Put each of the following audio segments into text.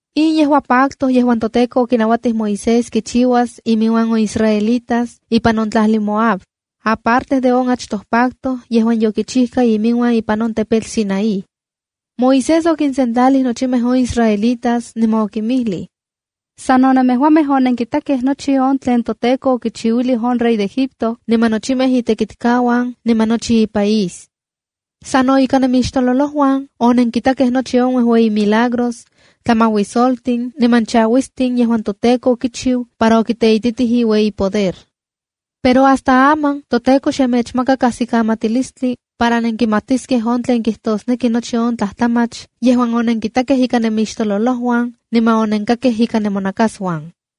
In yejua pacto yejuan toTEKO okinauatij Moisés kichiuas iminuan on israelitas ipan on tlajli Moab, aparte de on achtoj pacto yejuan yokichijka iminuan ipan on tepetl Sinaí. Moisés okinsentlalij nochimej on israelitas niman okinmijlij: “Sa no nemejuamej onenkitakej nochi on tlen toTEKO okichiuilij on rey Egipto niman nochimej itekitkauan niman nochi ipaís. Sa no ika nemixtololojuan onenkitakej nochi on uejueyi milagros, tlamajuisoltin niman chauistin yejuan toTEKO okichiu para okiteititij iueyipoder. Pero hasta aman toTEKO xe mechmaka kajsikamatilistli para nenkimatiskej on tlen kijtosneki nochi on tlajtlamach yejuan onenkitakej ika nemixtololojuan niman onenkakej ika nemonakasuan.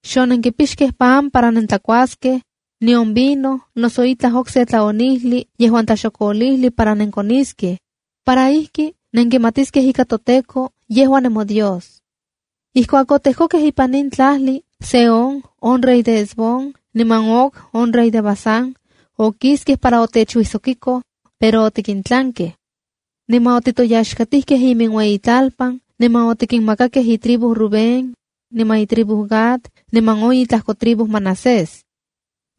Xonenkipixkej pan para nentlakuaskej, nion vino, noso itlaj okse tlaonijli yejuan tlaxokoliji para nenkoniskej, para ijki nenkimatiskej ika toTEKO yejua nemoDios. ’Ijkuak otejkokej ipan in tlajli, Sehón on rey de Hesbón, niman Og on rey de Basán, okiskej para otechuijsokiko, pero otikintlankej. Niman otitoyaxkatijkej iminueyitlalpan niman otikinmakakej itribu Rubén, niman itribu Gad niman on itlajkotribu Manasés.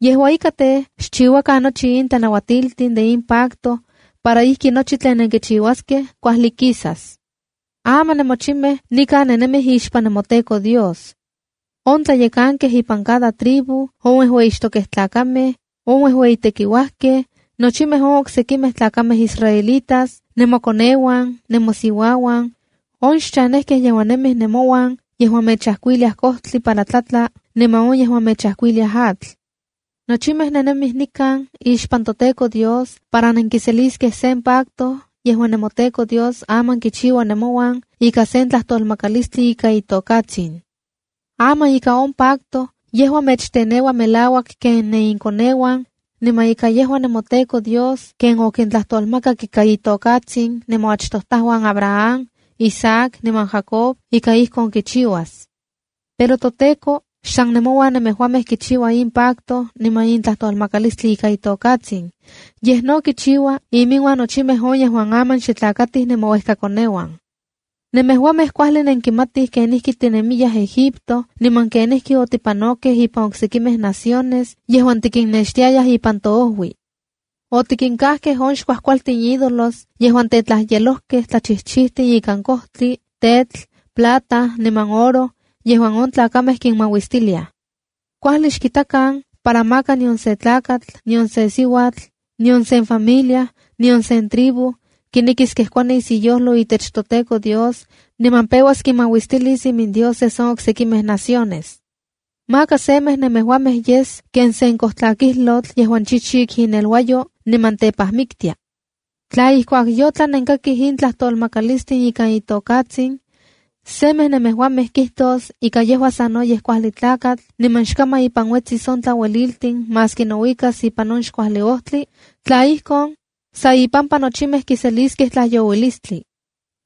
Yejua ika tej, xchiuakan nochi in tlanauatiltin de in pacto para ijki nochi tlen nenkichiuaskej kuajli kias. ’Aman nemochimej nikan nennemij ixpan nemoTEKO Dios: on tlayekankej ipan cada tribu, on uejueyixtokej tlakamej, on uejueyitekiuajkej, nochimej on oksekimej tlakamej israelitas, nemokoneuan, nemosiuauan, on xchanejkej yejuan nemij nenmouan yejuan mechajkuiliaj kojtli para tlajtla niman on yejuan mechajkuiliaj atl. Nochimej nennemij nikan ixpan toTEKO Dios para nenkiseliskej sen pacto yejuan nemoTEKO Dios aman kichiua nemouan ika sen tlajtolmakalistli ika itokatsin. Aman ika on pacto yejua mechteneua melauak ken nenikoneuan, niman ika yejua nemoTEKO Dios ken okintlajtolmak ika itokatsin nemoachtojtajuan Abraham, Isaac niman Jacob ika ijkon kichiuas. Pero toTEKO xsan nemouan nemejuamej kichiua in pacto niman in tlajtolmakalistli ika itokatsin, yej no kichiua iminuan nochimej on yejuan aman xe tlakatij nemouejkakoneuan. ’Nemejuamej kuajli nenkimatij kenijki tinemiyaj Egipto niman kenijki otipanokej ipan sekimej naciones yejuan tikinnextiayaj ipan toojui. Otikintakej on xkuajkualtin ídolos yejuan tetlajyelojkej tlachijchijtin ikan kojtli, tetl, plata niman oro yejuan on tlakamej kinmauistiliaj. Kuajli xkitakan para maka nion sen tlakatl, nion sen siuatl, nion sen familia, nion sen tribu kinekis kejkuanis iyojlo itech toTEKO Dios, niman peuas kinmauistilis imindioses on oksekimej naciones. Maka semej nemejuamej yes ken sen kojtlakijlotl yejuan chichik ineluayo niman tepajmiktia. ’Tla ijkuak yotlan nenkakij in tlajtolmakalistin ika itokatsin, semej nemejuamej kijtos ika yejua sanoyej kuajli tlakatl, niman xkaman ipan uetsis on tlaueliltin maski nouikas ipan xkuajli on ojtli, tla ijkon, san ipampa nochimej kiseliskej tlajyouilistli.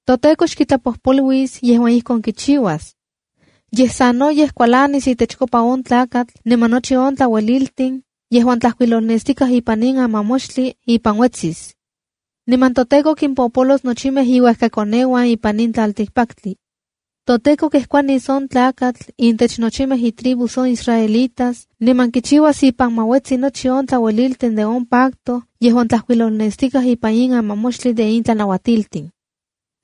ToTEKO xkitlapojpoluis yejuan ijkon kichiuas. Yej sanoyej kualanis itechkopa on tlakatl, niman nochi on tlaueliltin yejuan tlajkuilolnestikaj ipan in amamoxtli ipan uetsis. Niman toTEKO kimpopolos nochimej iuejkakoneuan ipan in tlaltikpaktli. ToTEKO kejkuanis on tlakatl intech nochimej itribus on israelitas niman kichiuas ipan ma uetsi nochi on tlaueliltin de on pacto yejuan tlajkuilolnestikaj ipan in amamoxtli de in tlanauatiltin.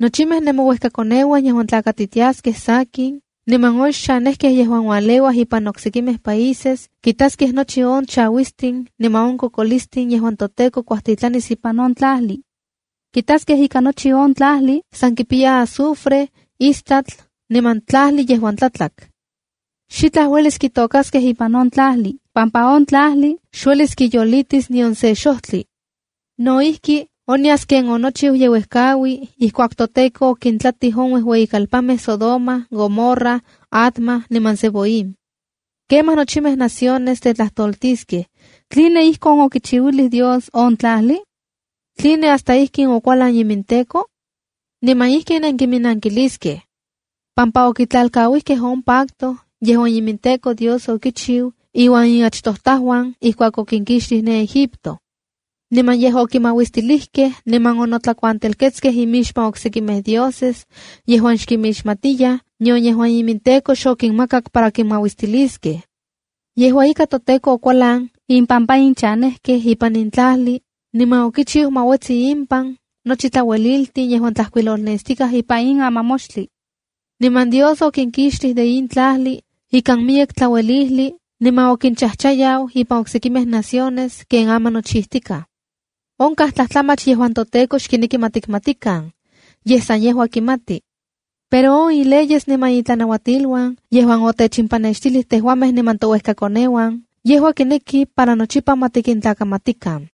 ’Nochimej nemouejkakoneuan yejuan tlakatitiaskej sakin, niman on xchanejkej yejuan ualeuaj ipan oksekimej países, kitaskej nochi on chauistin niman on kokolistin yejuan toTEKO kuajtitlanis ipan in tlajli. Kitaskej ika nochi in tlajli san kipiya azufre, istatl niman tlajli yejuan tlatlak. Xitla uelis kitôkaskej ipan on tlajli pampa on tlajli xuelis kiyolitis nion sen xojtli. No ijki, onyas ken onochiu yeuejkaui ijkuak toTEKO okintlatij on uejueyimej kalpanmej Sodoma, Gomorra, Adma niman Zeboim. ’Kemaj nochimej naciones tetlajtoltiskej: ‘¿Tline ijkin okichiuilij Dios on tlajli? ¿Tline hasta ijkin okualan iminTEKO?’ ’Niman ijkin kiminankiliskej: ‘Pampa okitlalkauijkej on pacto yejuan iminTEKO Dios okichiu iuan inachtojtajuan ijkuak okinkixtij ne Egipto. Niman yej okinmauistilikej niman onotlakuantelketskej imixpan oksekimej dioses yejuan xkinmixmatiyaj, nion yejuan iminTEKO xokinmakak para kinmauistiliskej. Yejua ika, toTEKO okualan impampa in chanejkej ipan in tlajli, niman okichiu ma uetsi impan nochi tlaueliltin yejuan tlajkuilolnestikaj ipan in amamoxtli. Niman Dios okinkixtij de in tlajli ikan miyek tlauejli niman okinchajchayau ipan oksekimej naciones ken aman nochijtikaj.’ ’Onkaj tlajtlajmach yejuan toTEKO xkineki ma tikmatikan, yej san yejua kimati. Pero on ileyes niman itlanauatiluan yejuan otechimpanextilij tejuamej niman touejkakoneuan, yejua kineki para nochipa ma tikintlakamatikan.